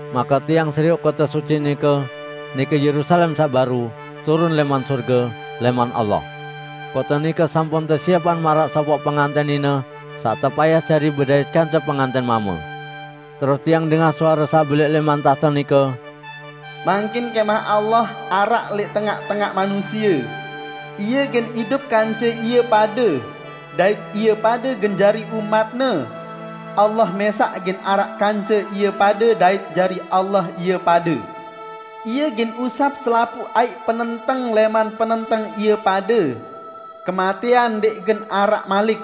Make tiang serioq kote suci nike, nike Yerusalem saq baru, turun lẽman sorge, lẽman Allah. Kote nike sampun tesiepang maraq sopoq pengantẽn nine saq tepayas jari bedait kance pengantẽn mame. Terus tiang dengah suare saq belẽq lẽman tahte nike, "Mangkin kẽmah Allah araq lẽq tengaq-tengaq manusie! Ie gen idup kance ie pade, dait ie pade gen jari umat-Ne. Allah mẽsaq gen araq kance ie pade dait jari Allah ie pade. Ie gen usap selapuq aiq penenteng lẽman penenteng ie pade. Kematẽan ndẽq gen araq malik;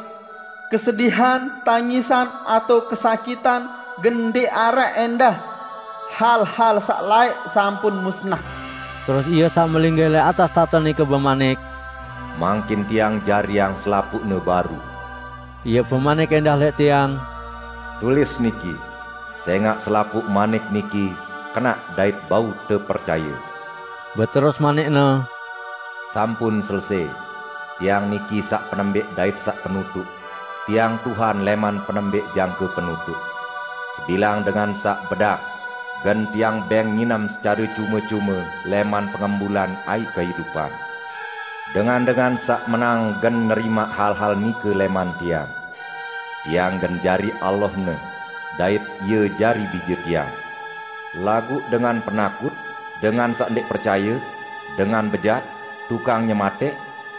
kesedihan, tangisan, atao kesakitan gen ndẽq araq ẽndah. Hal-hal saq laẽq sampun musnah." Terus Ie saq melinggih lẽq atas tahte nike bemanik, "Mangkin Tiang jariang selapuqne baru!" Ie bemanik ẽndah lẽq tiang, "Tulis niki, sẽngaq selapuq manik niki kenaq dait bau tepercaye." Beterus manik-Ne, "Sampun selesẽ! Tiang niki saq penembẽq dait saq penutuq; Tiang Tuhan lẽman Penembẽq jangke Penutuq. Sebilang dengan saq bedak, gen Tiang bẽng nginem secare cume-cume lẽman pengembulan aiq kehidupan. Dengan-dengan saq menang gen nerimaq hal-hal nike lẽman Tiang. Tiang gen jari Allahne, dait ie jari bije Tiang. Laguq dengan penakut, dengan saq ndẽq percaye, dengan bejat, tukang nyematẽq,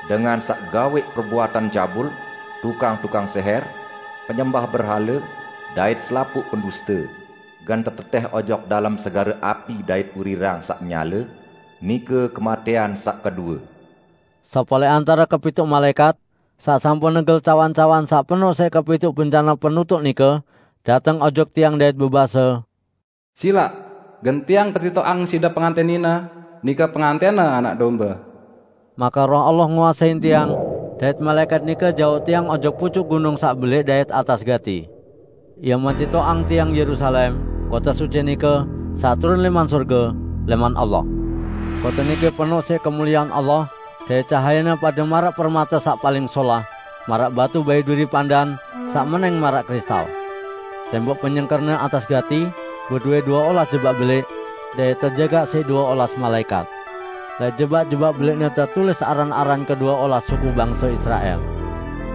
dengan saq gawẽq perbuatan cabul, tukang-tukang sẽhẽr, penyembah berhale, dait selapuq penduste, gen tetetẽh ojok dalem segare api dait urirang saq nyale, nike kematẽan saq kedue." Sopoq lẽq antare kepituq malaẽkat saq sampun negel cawan-cawan saq penoq siq kepituq bencane penutuq nike, dateng ojok tiang dait bebase, "Silaq! Gen tiang petitoqang side pengantẽn nine, nike pengantẽn-Ne Anak Dombe." Make Roh Allah nguasein tiang, dait malaẽkat nike jauq tiang ojok pucuk gunung saq belẽq dait atas gati. Ie metitoqang tiang Yerusalem, kote suci nike, saq turun lẽman sorge, lẽman Allah. Kote nike penoq siq kemuliean Allah dait cahayene pade maraq permate saq paling solah, maraq batu baiduri pandan saq menẽng maraq kristal. Tembok penyengkerne atas gati, bedowẽ due olas jebak belẽq, dait tejagaq siq due olas malaẽkat. Lẽq jebak-jebak belẽqne tetulis aran-aran kedue olas suku bangse Israel.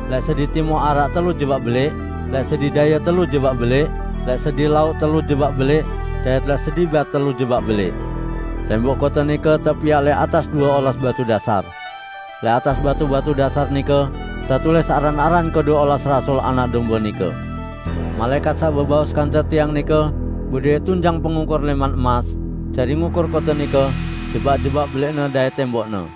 Lẽq sedi timuq araq telu jebak belẽq, lẽq sedi daye telu jebak belẽq, lẽq sedi lauq telu jebak belẽq dait lẽq sedi bat telu jebak belẽq. Tembok kote nike tepiaq lẽq atas due olas batu dasar. Lẽq atas batu-batu dasar nike tetulis aran-aran kedue olas rasul Anak Dombe nike. Malaẽkat saq bebaos kance tiang nike bedowẽ tunjang pengukur lẽman emas, jari ngukur kote nike, jebak-jebak belẽqne dait tembokne.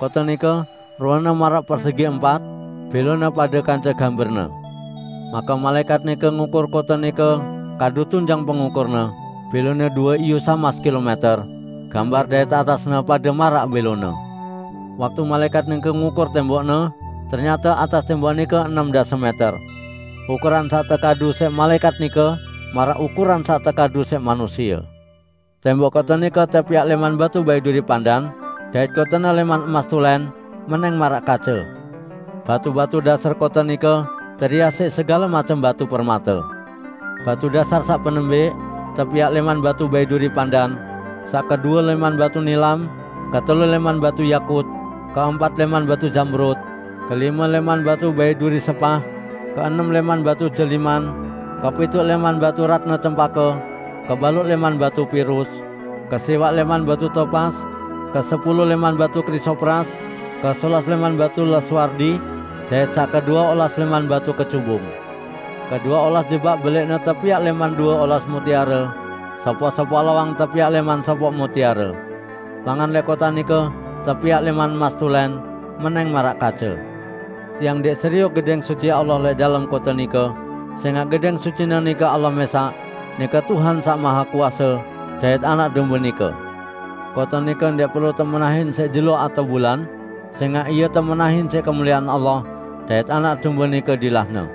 Kote nike ruene maraq persegi empat -- bẽlone pade kance gamberne. Make malaẽkat nike ngukur kote nike kadu tunjang pengukurne; bẽlone due iyu samas kilomẽter; gamber dait atasne pade maraq bẽlone. Waktu malaẽkat nike ngukur tembokne, ternyate atas tembok nike enem dase mẽter. Ukuran saq tekadu siq malaẽkat nike maraq ukuran saq tekadu siq manusie. Tembok kote nike tepiaq lẽman batu baiduri pandan, dait kotene lẽman emas tulẽn, menẽng maraq kace. Batu-batu dasar kote nike terias siq segale macem batu permate. Batu dasar saq penembẽq tepiaq lẽman batu baiduri pandan, saq kedue lẽman batu nilam, ketelu lẽman batu yakut, keempat lẽman batu zamrud, kelime lẽman batu baiduri sepah, keenem lẽman batu jeliman, kepituq lẽman batu ratne cempake, kebaluq lẽman batu pirus, kesiwaq lẽman batu topas, kesepulu lẽman batu krisopras, kesolas lẽman batu lazuardi, dait saq kedue olas lẽman batu kecubung. Kedue olas jebak belẽqne tepiaq lẽman due olas mutiare, sopoq-sopoq lawang tepiaq lẽman sopoq mutiare. Langan lẽq kote nike tepiaq lẽman emas tulẽn, menẽng maraq kace. Tiang ndẽq serioq Gedẽng Suci Allah lẽq dalem kote nike, sẽngaq Gedẽng Sucine nike Allah mẽsaq, nike Tuhan Saq Mahekuase, dait Anak Dombe nike. Kote nike ndẽq perlu temenahin siq jelo atao bulan, sẽngaq ie temenahin siq kemuliean Allah, dait Anak Dombe nike dilahne.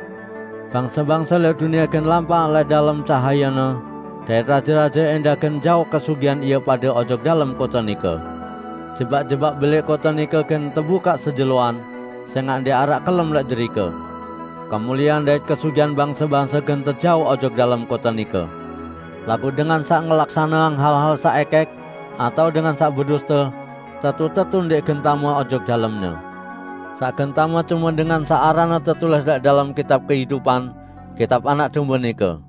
Bangse-bangse lẽq dunie gen lampaq lẽq dalem cahayene, dait raje-raje ẽndah gen jauq kesugihan ie pade ojok dalem kote nike. Jebak-jebak belẽq kote nike gen tebukaq sejeloan; sẽngaq ndẽq araq kelem lẽq derike. Kemuliean dait kesugihan bangse-bangse gen tejauq ojok dalem kote nike. Laguq dengan saq ngelaksaneang hal-hal saq ẽkẽk, atao dengan saq beduste -- tetu-tetu ndẽq gen tame ojok dalemne. Saq gen tame cume dengan saq aranne tetulis lẽq dalem kitab kehidupan, kitab Anak Dombe nike.